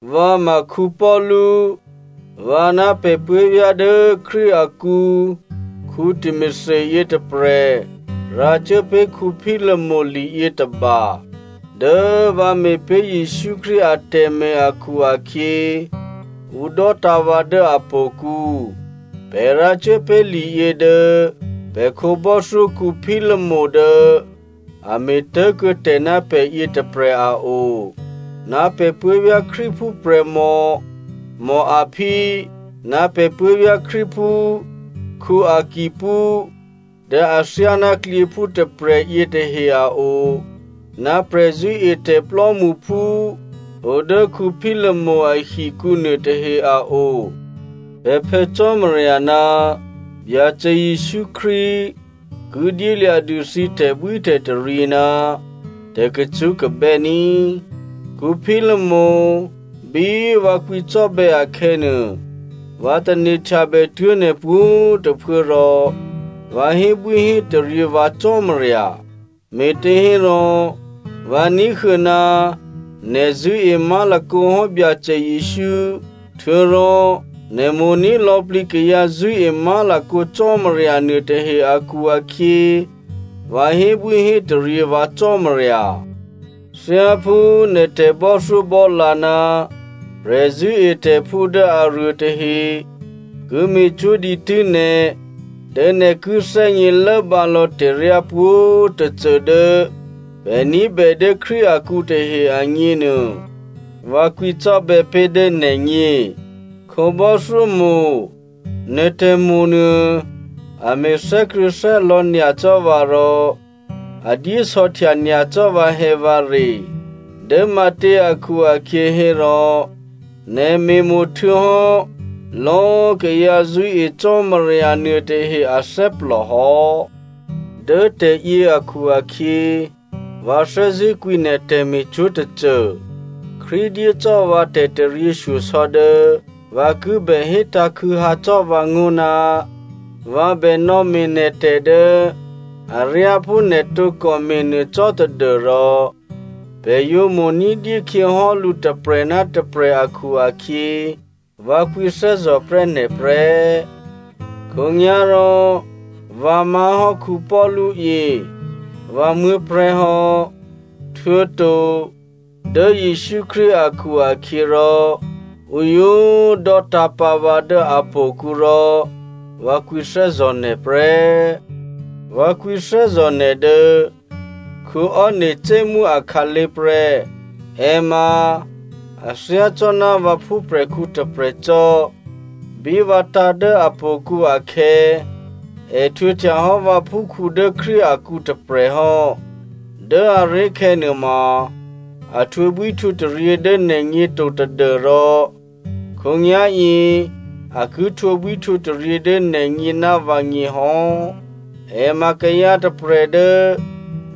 Vǎ ma Paulu. Vǎ ná pè̤ puố̤vyá̤ dố Krístu akǔ Timothy yětôprè̤ rǎcuốpé̤ Philomena liyětôba. Dố vǎ me̤pé̤ Jesǔ Krístu atè̤me̤ akhu-akhyě, ǔ dò́tǎ̤ vǎ dố htò̌kǔ. Pè̤ rǎcuốpé̤ liyě dố pè̤ khǒbò́thyó Philomena dố a me̤ tố̤kuô̌tè̤ ná pè̤ yětôprè̤ a o, ná pè̤ puố̤vyá̤ Krístuphú prè̤mò Apphia, ná pè̤ puố̤vyá̤ Krístuphú Arkippo dố athyáná klyěphú tôprè̤ yětahe a o, ná prè̤zṳ̂́etè̤ plò́mṳphú o dố Philomena ahikǔ nuôtahe a o. Pè̤ Phè̌ Cò́marya ná Byacè Jesǔ Krístu ki dyélya̤dû thǐ tè̤bwítè̤taryě ná tè̤kacṳ́kabè́ ní꤮. Philomena꤮, bí vǎ kwǐcò́bè̌ akhè̌nuô, vǎ tane̤htyabè tuố̤ nè̤ pwǒ̤꤮ tôphuố rò vǎ hébwíhétaryě vǎ Cò́marya. Me̤těhérò, vǎ ní̤huô̌ ná nè̤ zṳ̂́e má̤lakǒ hò́ Byacè Jesǔ htuô̌rò nè̤ mo̤ní̤ lò̌plǐ kayǎ zṳ̂́e má̤lakǒ Cò́marya nuôtahe akhu-akhyě, vǎ hébwíhétaryě vǎ Cò́marya. Thyáphú nè̤ tè̤bò́thyóbò́lǎ ná prè̤zṳ̂́etè̤phú dố aruôtahe ki me̤cwó̤ dǐtû́ nè̤ dố nè̤ ki thè́gně lốbǎlò̌ tè̤ryá pwǒ̤꤮ tôcô dố pè̤ ní̤bè dố Krístu akǔ tahe agněnuô vǎ kwǐcò́bè̌ pé̤ dố nè̤gně. Khǒbò́thyó mo̤, nè̤ tè̤mo̤ nuô, a me̤ thè́krṳ̂̌thè́lò̌ nyacò́ vǎ rò a dyé sò̌htya nyacò́ vǎhè̌vǎre. Dố matě akhu-akhyě hérò nè̤ me̤mo̤ htuô̌hò́ lò̌꤮ kayǎ zṳ̂́e Cò́marya nuôtahe athè́plò hò́. Dố tè̤yě akhu-akhyě, vǎ thè́zṳ̂́ kwǐ nè̤ tè̤me̤cwó̤ tôcô. Krístu dyé cò́ vǎ tè̤taryěshyosò̌ dố vǎ ki bè hétǎ̤ khû̌hǎ cò́ vǎngó̤ ná vǎ bè nò̌me̤ nè̤ tè̤ dố aryá phú nè̤ tǒkò me̤nuô cò́ tadû́rò, pè̤ yǒ mo̤ ní̤dyé khyěhò́lǔ tôprè̤ ná tôprè̤ akhu-akhyě, vǎ kwǐthè́zò̤prè́ nè̤ prè́. Khǒnyá̤rò vǎ má̤hò́ Paulu yě, vǎ muố̤prè̤́hò́, htuô̌to dố Jesǔ Krístu akhu-akhyěrò ǔ yǒ꤮ dò́tǎ̤pǎ vǎ dố htò̌kǔ rò vǎ kwǐthè́zò̤ nè̤ prè́. Vǎ kwǐthè́zò̤ nè̤ dố Onesimo akhǎlé̤ prè́. È ma a thyácò́ná vǎ phúprè̤khǔ tôprè̤ cò́. Bí vǎ tǎ̤ dố htò̌kǔ akhè̌, è htwǒhtyahò́ vǎphúkhǔ dố Krístu akǔ tôprè̤hò́. Dố aré̤khè̌ nuôma a htwǒbwíhtwǒtaryě dố nè̤gně to tadû́rò khǒnyá̤yě a ki htwǒbwíhtwǒtaryě dố nè̤gně ná vǎgně hò́. È ma kayǎ tôprè̤ dố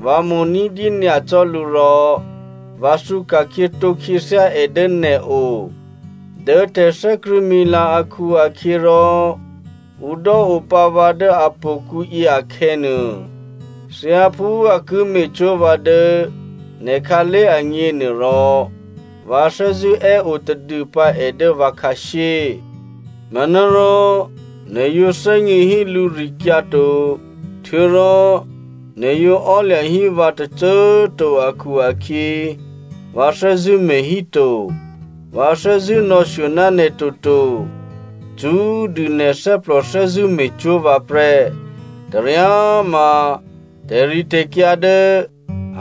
vǎ mo̤ ní̤dyé nyacò́ lǔ rò vǎ thǔka̤khyě tǒkhyěthyá è dố nè̤o. Dố tè̤thè́krṳ̂̌mila akhu-akhyěrò ǔ dò́opǎ vǎ dố htò̌kǔ yěakhè̌nuô, thyáphú a ki me̤cwó̤ vǎ dố nè̤ khǎlé̤ agněnuôrò, vǎ thè́zṳ̂́ è́ o tadûpǎ è dố vǎ khǎshyé. Manárò nè̤ yǒ thè́gně hí lǔrikyǎ to, htuô̌rò nè̤ yǒ ò́lya̤ hí vǎ tôcô꤮ to akhu-akhyě, vǎ thè́zṳ̂́ me̤híto. Vǎ thè́zṳ̂́ nò̌shyo ná nè̤ toto. Cṳ́꤮ dû nè̤ thè́plò thè́zṳ̂́ me̤cwó̤ vǎ prè́. Taryáma tè̤ritè̤kyǎ dố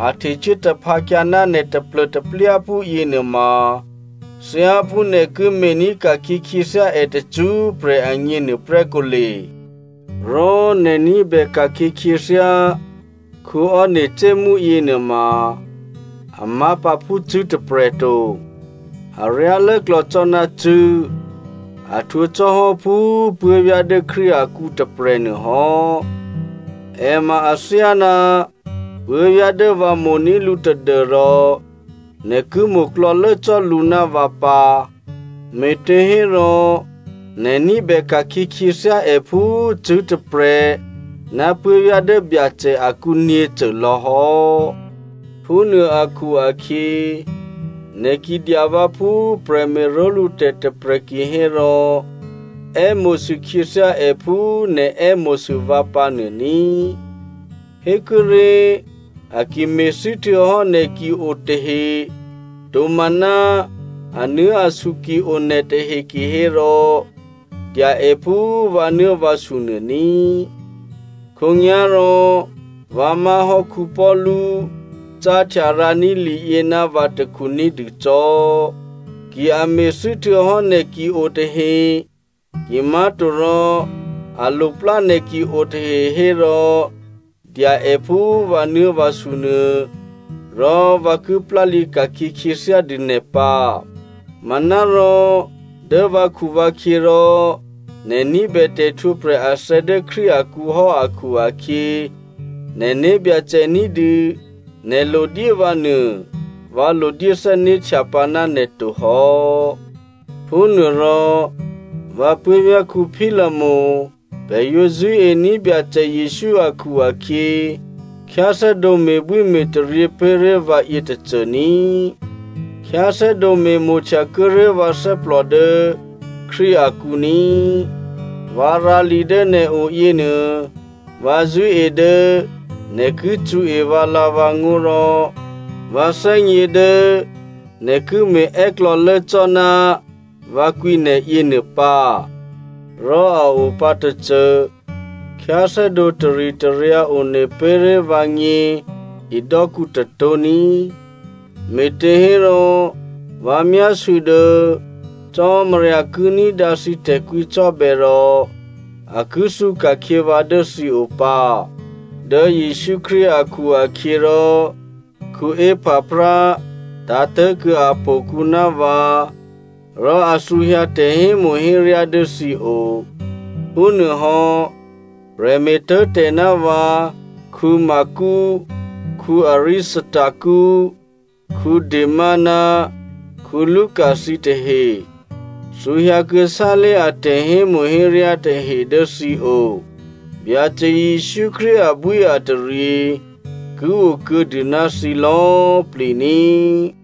a htecuố taphǎkyǎ ná nè̤ taplô̤taplyáphú yěnuôma thyáphú nè̤ ki me̤ní̤ ka̤khyě khyěthyá è tacṳ́prè̤ agně nuôprè́ kǒle. Rò nè̤ ní̤bè ka̤khyě khyěthyá Onesimo yěnuôma a má̤pǎ phú cṳ̂́ tôprè̤ to, aryá lốklò̌ cò́ ná cṳ̂́, a htwǒ cò́ hò́ phú꤮ puố̤vyá̤ dố Krístu akǔ tôprè̤ nuôhò́. È ma athyáná puố̤vyá̤ dố vǎ mo̤ní̤ lǔ tadû́rò nè̤ ki mo̤klò̌lố cò́ lǔ ná vǎ pǎ, me̤těhérò nè̤ ní̤bè ka̤khyě khyěthyá è phú cṳ̂́ tôprè̤ ná puố̤vyá̤ dố Byacè akǔ nyě̤cô lò̌hò́. Phúnuô akhu-akhyě, nè̤ ki dya vǎ phú prè̤me̤ró̤lǔtè̤ tôprè̤ kihérò è́mo̤sû khyěthyá è phú nè̤ è́mo̤sû vǎ pǎ nuô ní꤮. Hékuốré̤, a ki me̤thû́ htuô̌hò́ nè̤ ki o tahe, tomaná anuố̤asu ki o nè̤ tahe kihérò dya è phú vǎnuố̤vǎsu nuô ní꤮. Khǒnyá̤rò vǎ má̤hò́ Paulu cáhtya rǎní̤ liyě ná vǎ takhu ní̤dûcò́. Ki a me̤thû́ htuô̌hò́ nè̤ ki o tahe, kimá̤torò a loplá nè̤ ki o tahe hérò dya è phú vǎnuố̤vǎsu nuô, rò vǎ ki plálǐ ka̤khyě khyěthyá dû nè̤ pǎ. Manárò dố vǎkhuvǎkhyě rò, nè̤ ní̤bè tè̤htwǒprè̤ athè̌ dố Krístu akǔ hò́ akhu-akhyě, nè̤ né̤byacè ní̤dû nè̤ lodyé vǎ nuô, vǎ lodyé thè́né̤htyapǎ ná nè̤ tohò́. Phúnuôrò, vǎ puố̤vyá̤ Philomena꤮ pè̤ yǒ zṳ̂́ení̤ Byacè Jesǔ akhu-akhyě, khyáthè́dǒ me̤bwíme̤taryě pé̤ré̤ vǎ yětôcô ní꤮. Khyáthè́dǒ me̤mo̤htya kuô̌ré̤ vǎ thè́plò dố Krístu akǔ ní꤮. Vǎ rǎ li dố nè̤o yěnuô, vǎ zṳ̂́e dố nè̤ ki cṳ̌e vǎlǎ̤vǎngó̤ rò vǎ thè́gně dố nè̤ ki me̤è́klò̌lố cò́ ná vǎ kwǐ nè̤ yěnuô pǎ. Rò a opǎ tôcô: khyáthè́dǒ taritaryǎ one pé̤ré̤ vǎgně hidò́kǔ tôtó̤ ní꤮, me̤těhérò vǎ myásû̌ dố Cò́marya ki ní̤dǎ thǐ tè̤kwǐcò́bè̌ rò a ki thǔka̤khyě vǎ dố thǐ o pǎ. Dố Jesǔ Krístu akhu-akhyěrò, Epaphra tǎ̤tố̤kuô̌ htò̌kǔ ná vǎ, rò a thǔhyǎ tè̤hémo̤héryá dố thǐo. Phúnuôhò́ prè̤me̤tố̤tè̤ ná vǎ Marko, Aristarko, Dema ná Luka thǐtahe thǔhyǎ kuô̌sálé̤ a tè̤hémo̤héryá tahe dố thǐo. Byacè Jesǔ Krístu abwíataryě ki okuô̌dû ná thǐ lò̌꤮ plǐ ní꤮.